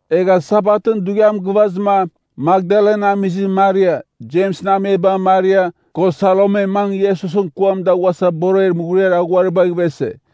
Egha Sabatɨn dughiam gɨvazɨma, Makdalan amizim Maria, Jemsɨn amebam Maria, ko Salome mangɨ Iesusɨn kuam daghuasa borer mughuriar aghuaribagh ivese.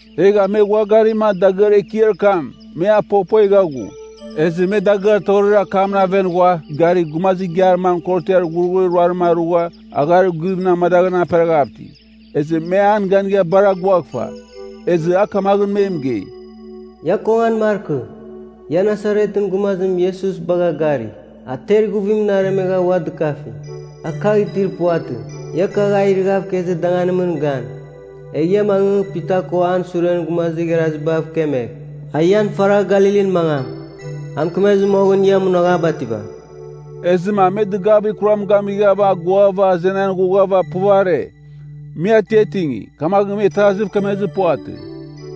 Egha me ghua garima dagɨar ekiar kam, me a poghpuegha ghu. Ezɨ me dagɨar torir akamɨn aven ghua garima gumazir igiar mam korotiar ghurghurir ruarim arugha agharir guvimɨn amadaghan aperaghav iti. Ezɨ me an ganigha bar aguaghfa. Ezɨ a kamaghɨn mɨgei, “Ia akongan markɨ. Ia Nasaretɨn gumazim Iesus bagha gari. A ter ighuvimɨn aremegha ua dɨkafi! A kagh itir puvatɨ. Ia kagh a irɨghav ikezir danganimɨn gan. Egh ia mangɨ, Pita ko an suren gumazir igharazibav kemegh, ‘A ian faragh Galilin mangam. A mɨkemezir moghɨn ia munagh a bativam.’” Ezɨma me dɨgavir kuram gamigha aguava azenan ghuegha puv are. Me atiatingi, kamaghɨn me taraziv kemezir puvatɨ.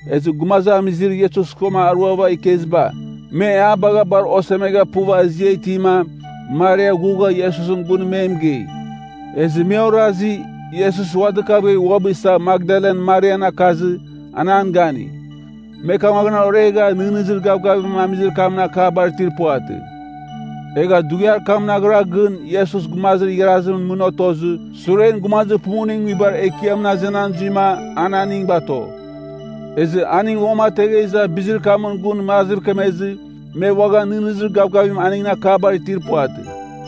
Ezɨ gumazamizir Iesus ko aruava ikeziba, me a bagha bar osemegha puv azia itima, Maria ghugha Iesusɨn gun me mɨgei. Ezɨ me orazi, Iesus ua dɨkavigha uabɨ isa Makdalan Marian akazɨ, an an gani. Me kamaghɨn oregha nɨghnɨzir gavgavim amizir kamɨn akabar itir puvatɨ. Egha dughiar kamnaghra gɨn Iesus gumazir igharazimɨn mɨn otozɨ suren gumazir pumuning nguibar ekiamɨn azenan zuima an aning bato. Ezɨ aning uamategha iza bizir kamɨn gun maraziv kemezɨ, me uaghan nɨghnɨzir gavgavim aningɨn akabar itir puvatɨ.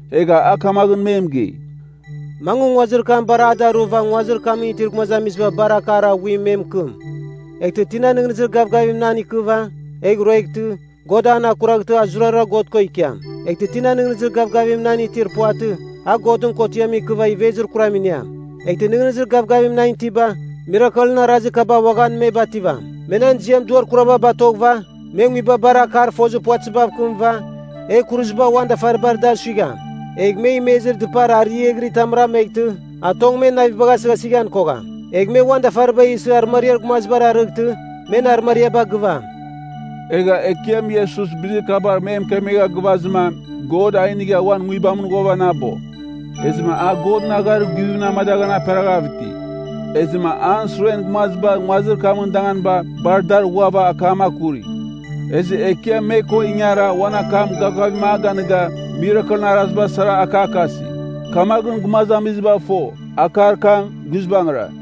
Egha a kamaghɨn me mɨgei, “Mangɨ nguazir kam bar a daruva nguazir kamɨn itir gumazamiziba bar akar aghuim me mɨkɨm. Eghtɨ tina nɨghnɨzir gavgavim nan ikɨva, egh rueghtɨ, God an akuraghtɨ, a zurara God ko ikiam. Eghtɨ tina nɨghnɨzir gavgavim nan itir puvatɨ, a Godɨn kotɨn ikɨva ivezir kuram iniam. Eghtɨ nɨghnɨzir gavgavim nan itiba, mirakelɨn arazir kaba uaghan me bativam: me nan ziam duar kuraba batoghɨva, me nguibabar akar fozir puvatɨzibav kɨmɨva, egh kuruziba uan dafaribar dar suigham. Egh me imezir dɨpar ariaghɨritamar ameghtɨ a tong men navibagh asɨghasighan kogham. Egh me uan dafariba isɨ arɨmariar gumazibar arɨghtɨ men arɨmariaba gɨvam.” Egha Ekiam Iesus bizir kabar me mɨkemegha gɨvazɨma God a inigha uan nguibamɨn ghuavanabo. Ezɨma a Godɨn agharir guvimɨn amadaghan aperaghav iti. Ezɨma an suren gumaziba nguazir kamɨn danganiba bar dar ghuava akam akuri. Ezɨ Ekiam me ko ingara uan akam gavgavim a ganɨga mirakelɨn araziba sara akakasi, kamaghɨn gumazamiziba fo, akar kam guizbangɨra.